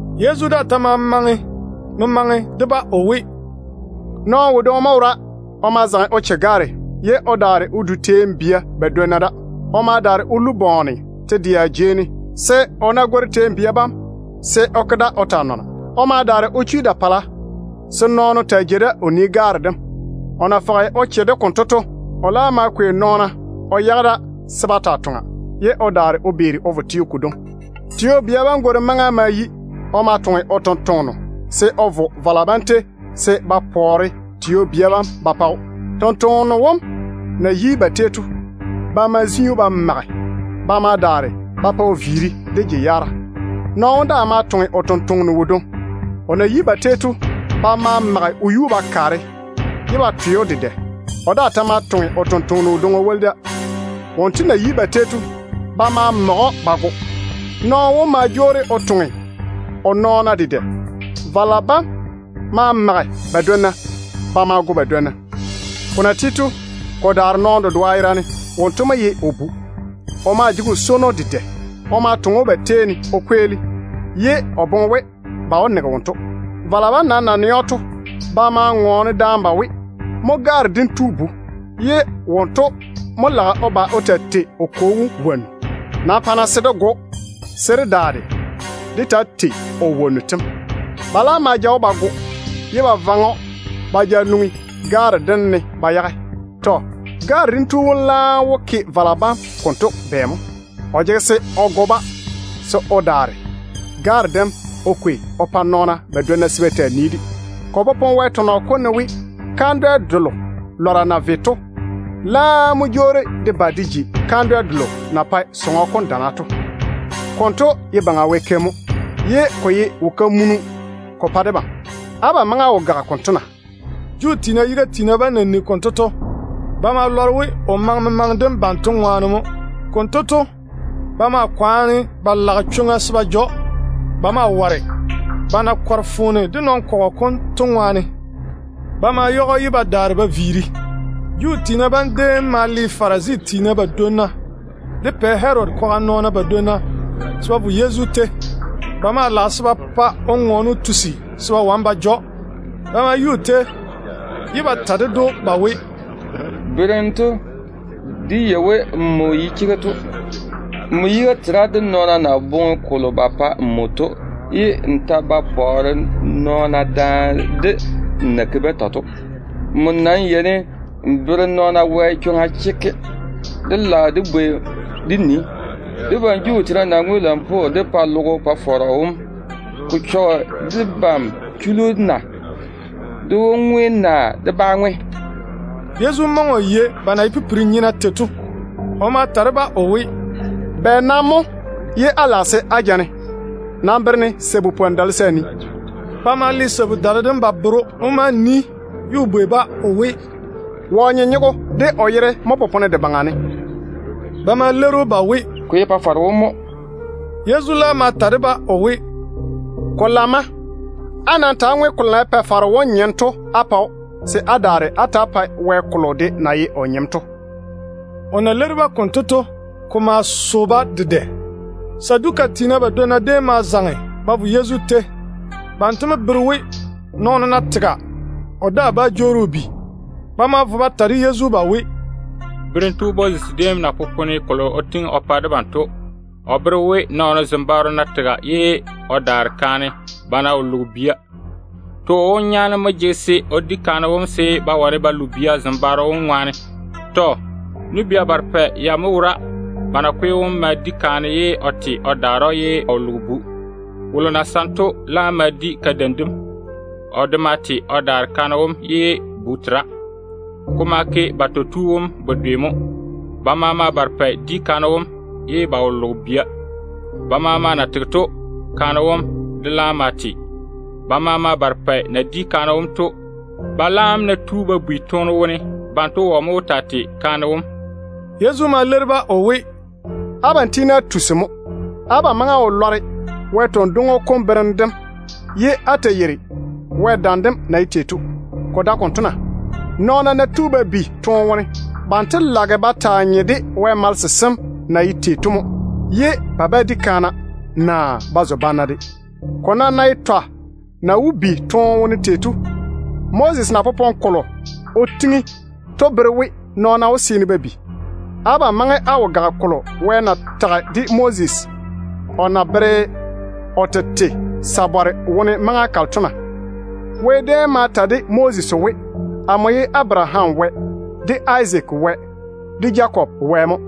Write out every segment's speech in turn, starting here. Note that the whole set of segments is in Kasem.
Yezu daa ta ma maŋe memaŋe de-ba o we, “Nɔɔno wodwoŋi mo wora. O ma zaŋe o che gaare, ye o daare o jeiri Vini teeni de wone. O ma daare o ko gwoŋo te-dɛa jei ne se o ná gwori teeni bia bam, se o ke da o nɔ o ŋoke te nyoa bam. O ma daare o chwi da-pala se nɔɔno taa jei da o yere gaare dem. O na fɔge o che-de konto to, o laam ma kwei nɔɔna o yage da se ba taa toŋa, ye o daare o beeri o vo teo kodwoŋi. Tio-bia bam gworim maŋa ma yi. O ma toŋe o tontoŋeno se o vo vala bam tei se ba pɔɔre tio-bia bam ba pa‑o. Tontoŋeno wom na yi ba tei to, ba ma zi‑o ba mage. Ba ma daare ba pa o viiri de je-yaara. Nɔɔno wom daa ma toŋe o tontoŋeno wodwoŋi. O na yi ba tei to, ba ma mage o yuu ba kaare ye ba twe‑o dedɛ. O daa ta ma toŋe o tontoŋeno wodwoŋi o woli da. Wonto na yi ba tei to, ba ma mage‑o ba go. Nɔɔno wom ma jwoori o toŋe o nɔɔna dedɛ. Vala bam ma mage ba badwonna. Ba ma go badwonna. Ko na ti to, ko daare nɔɔno dedoa yerane mo. Wonto ye o bu mo. O maa jege o swono dedɛ. O ma toŋe‑o ba tei ne o kweeli, ye o boŋe we, ba wó nege wonto. Vala bam nam na nɛ‑o to, ba ma bane daane ba we, ‘Mo gaare dem tu bu-kwea kam, ye wonto mo lage o ba o taa tei o kwo wom wonnu. Nam pa-na se dé go‑o, se dé daare dé taa tei o wonnu tem.’ Ba laam ma ja‑o ba go, ye ba vaŋe‑o ba ja nwoŋi gaare dem ne ba yage. Tɔ. Gaare dem tu wom laam wó ke vala bam konto bɛ mo? O jege se o ba o go-ba, se o daare gaare dem o kwei o pa nɔɔna badwonna se ba taa nii-de. Ko popone Wɛ tɔnɔ kom ne we: ‘Kandwɛ delo lɔra na ve to laam mo jwoori de ba de ji kandwɛ delo na pae diga kam dana to. Konto ye Baŋa Wɛ keim mo. Ko maa ye wo-kenkagele ko pa debam.’ Abam nam maŋe á wo gage konto na?” Juu tiina yiga tiina bam na nigi konto to, ba ma lɔre we o maŋe memaŋe dem banto ŋwaane mo. Konto to, ba ma kwaane ba lage chwoŋa se ba ja‑o. Ba ma ware, ba na kɔre foone de nɔn-kɔgɔ kom to ŋwaane. Ba ma yage‑o ye ba daare ba viiri. Juu tiina bam déem ma le Farisi tiina badwonna de Pɛ Herodi kwaga nɔɔna badwonna se ba vo Yezu tei. Ba maa lage se ba pa o ŋɔɔne o tusi se ba wane ba ja‑o. Ba ma yi o tei ye ba ta ded‑o ba we, “Berem tu, dé yei we nmo ye chega tu mo. Nmo yiga tera de nɔɔna na boŋe kolo ba pa nmo to, ye n ta ba pɔɔre nɔɔna daane de n na ke-ba tei to. Nmo nam yeini n bere nɔɔna Wɛ chwoŋa chekke. Dé lage dé bwei dé nii, debam Juu tiina ná ŋwe lampwoo dé pa logo kom Pa-faro wom, ko chɔge debam chullu na? Dé wó ŋwe naa dé bá ŋwe?” Yezu maŋe o yei ba na ye pipiri-nyena tei to. O ma ta de-ba o we, “Bɛ nam mo ye á lage se á ja-ne? Nam bere-ne sabu-dale se a nii.” Ba ma le sabu-dale dem ba bere‑o. O ma nii ye o bwei-ba o we, “Wɔ nyenyego de o yere mo ba sare ba yage de baŋa ne?” Ba ma leiri‑o ba we, “Ko ye Pa-faro wom mo.” Yezu laam ma ta de-ba o we, “Ko lamma. Á nam ta‑á ŋwe kolo na ye Pa-faro wom nyem to á pa‑o, se á daare á ta‑á pae Wɛ kolo de na ye o nyem to.” O na leiri-ba konto to, ko ma so-ba dedɛ. Saduka tiina badwonna déem ma zaŋe ba vo Yezu tei. Banto mo bere we, nɔɔno ná tega, o daa bá jwoori o bi. Ba ma vo ba ta de Yezu ba we, “Berem tu, Moses déem na popone kolo o tiŋi o pa debam to, o bere we, nɔɔno zembaaro ná tega ye o daare kaane, ba ná wo loge bia, too wom nyaane mo jege se o di kaane wom se ba wane ba lo bia zembaaro wom ŋwaane. Tɔ. Nu-bia barepɛ ya mo wora. Ba nakwe wom ma di kaane. Kaane wom ma te o daare‑o ye o wo loge bu. Wolo na saŋe to laam ma di kadeim dem. O de ma te o daare kaane wom ye bu tera. Ko ma ke batɔ tu wom bedwe mo. Ba maama barepɛ di kaane wom, ye ba wo loge bia. Ba maama na tege to, kaane wom de laam ma te. Ba maama barepɛ na di kaane wom to, ba laam ná tu ba bi toone wone, banto wɔ mo wó taa tei kaane wom?” Yezu ma leiri-ba o we, “Abam tiini á tusi mo. Abam maŋe á wo lɔre Wɛ tɔn-dwoŋo kom berem dem, ye á ta yeiri Wɛ dam dem na ye tei to. Ko dae konto na? Nɔɔna ná tu ba bi toone wone, banto lage ba taa nye de Wɛ malese sem na ye tei to mo, ye ba ba di kaana, naa ba zo banna de. Ko nam ná ye twa na wó bi toone wone tei to, Moses na popone kolo o tiŋi to bere we nɔɔna wó seene ba bi. Abam maŋe á wo gage kolo Wɛ na tage de Moses o na veere o tete sabare wone maŋa kalo to na? Wɛ déem tage de Moses o we, ‘Amo ye Abaraham Wɛ, de Izaak Wɛ, de Jakob Wɛ mo.’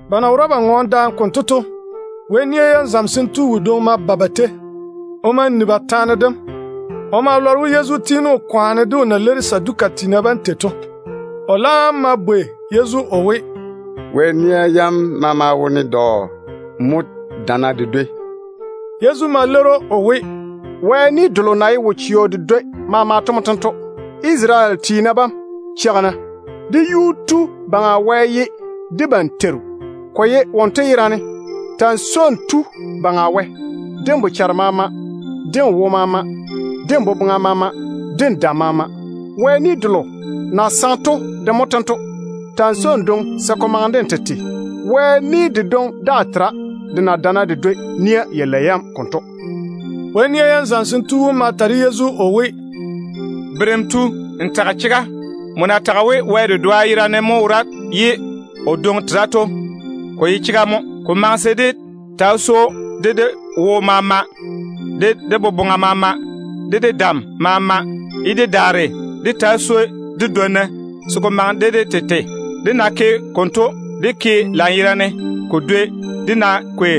Ba na wora ba ŋɔɔne daane konto to, Wɛ nia yam zamesem tu wodwoŋi ma ba ba tei. O ma ni ba taane dem. O ma lɔre we Yezu tiini o kwaane de o na leiri Saduka tiina bam tei to. O laam ma bwei Yezu o we, “Wɛ nia yam maama wone dɔ mo dana de dwoi?” Yezu ma leiri‑o o we, “Wɛ ni delo na ye wo-chɛɔ de dwoi maama to mo tento: ‘Isarele tiina bam, cheigi-na. Dé Yuu-tu Baŋa Wɛ ye debam Teiru, ko ye wonto yerane. Ta‑n swoi n tu Baŋa Wɛ wom de n bochare maama, de n wo maama, de n boboŋa maama, de n dam maama.’ Wɛ ni delo na saŋe to mo tento: ‘Ta‑n swoi n dwoŋi se ko maŋe de n na swoi n tete tei to.’ Wɛ ni dedwoŋi daa tera de na dana de dwoi nia yalei yam konto.” Wɛ nia yam zamesem tu wom ma ta de Yezu o we, “Berem tu, n tage chega. Nmo na tage we Wɛ dedoa yerane mo wora ye o dwoŋi tera to, ko ye chega mo. Ko maŋe se dé taa swoi‑o de dé wo maama, de dé boboŋa maama, de dé dam maama, ye dé daare dé taa swoi dé dwonna se ko maŋe de dé tete. Dé ná ke konto, ko bere we dé ke lanyerane ko dwoni dé ná ke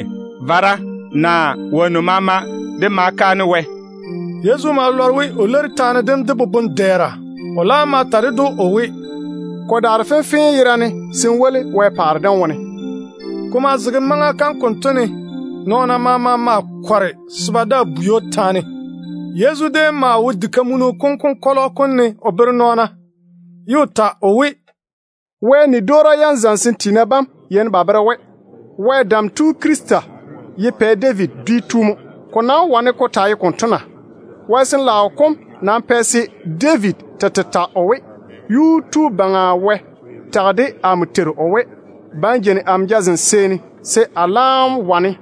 zwɛɛm kaanem naa kaanem dwi delo maama dé pa Wɛ.” Yezu ma lɔre we o leiri taane dem de boboŋ-dɛɛra. O laam ma ta ded‑o o we, “Ko daare fenfee yerane se n zo Wɛ paare dem wone.” Ko maa zege maŋa kam konto ne nɔɔna maama maa kɔre se ba daa bwei‑o taane. Yezu déem maa wo Wɛ diga kam konkɔlɔ kom ne o bere nɔɔna, ye o ta o we, “Wɛ ni-dwoora zamesem tiina bam yeini ba bere we, Wɛ Dam Tu Krista ye Pɛ David dwi tu mo. Ko nam wó wane ko taa ye konto na? Wɛ Sin-laao kom nam pɛ se David tete ta o we, ‘Yuu-tu Baŋa Wɛ tage de amo Teiru wom o we: Ba n jeini amo jazem seeni se a laam wane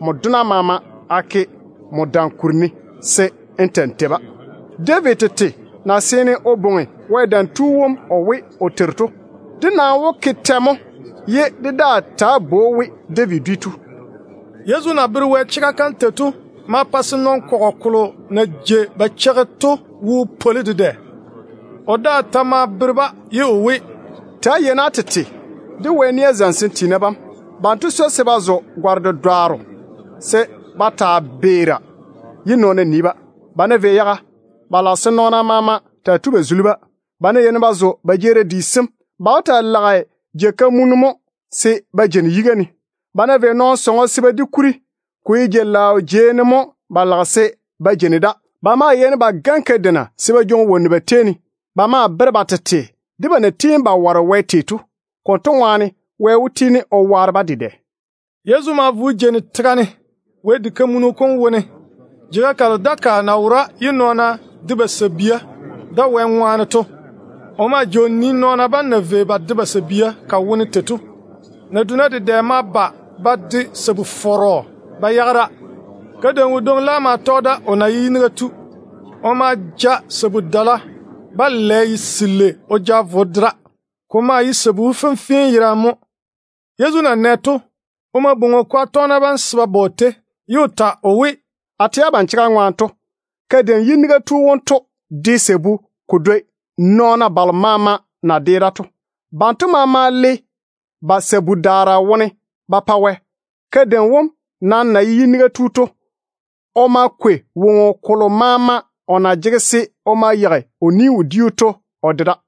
nmo dona bam maama a ke nmo dam kuri ne se n ta‑n tei-ba.’ David tete na seene o bwoŋi Wɛ Dam Tu wom we, o Teiru to, dé nam wó ke tɛ mo ye dé daa ta bwoi‑o we David dwi tu?” Yezu na bere Wɛ chega kam tei to ma pa se nɔn-kɔgɔ kolo na jei ba cheigi to wo pwoli dedɛ. O daa ta ma bere-ba o we, “Ta‑á cho-na á tete de Wɛ nia zamesem tiina bam. Banto swoi se ba zo gare-dedwaaro se ba taa beera ye nɔɔna nii-ba. Ba ná vei yaga, ba lage se nɔɔna maama taa tui ba zuli-ba. Ba ná yeini ba zo ba jeerim di sem, ba wó taa lage jei-kamunu mo se ba jeini yiga ne. Ba ná vei nɔɔno sɔŋɔ se ba di kuri, ko ye jei-laao jeiga ne mo ba lage se ba jeini da. Ba maa yeini ba gane kadeina ba jwoŋi wonnu ba tei ne. Ba maa bere ba tete de ba na tiini ba ware Wɛ tei to. Konto ŋwaane Wɛ wó tiini o waare-ba dedɛ.” Yezu ma vo o jeini tega ne Wɛ diga kam wone, jeiga kalo Wɛ pɛɛra dakaa kam na wora to. O maa jei o nii nɔɔna bam na vei ba de ba sabia ka wone tei to. Naduna dedɛ ma ba ba de sabu-fɔrɔ ba yage da. Kadeim wodwoŋi laam ma tɔge da, o na ye yiniga tu. O ma ja sabu-dala-balɛ selei o vo o de da. Ko maa ye sabu fenfee yerane mo. Yezu na nɛ to, o ma bwoŋi o kwaga tɔgena bam se ba ba o tei, ye o ta o we, “A tɛ abam chega ŋwaane to, kadeim wonto de sabu ko dwoi nɔɔna balo maama na de da to. Banto maama le ba sabu-daara wone mo ba pa Wɛ. Kadeim wom nam na ye yiniga tu to, o ma kwei woŋo kolo maama o na jege se o ma yeigi o ni-wodiu to o de da.”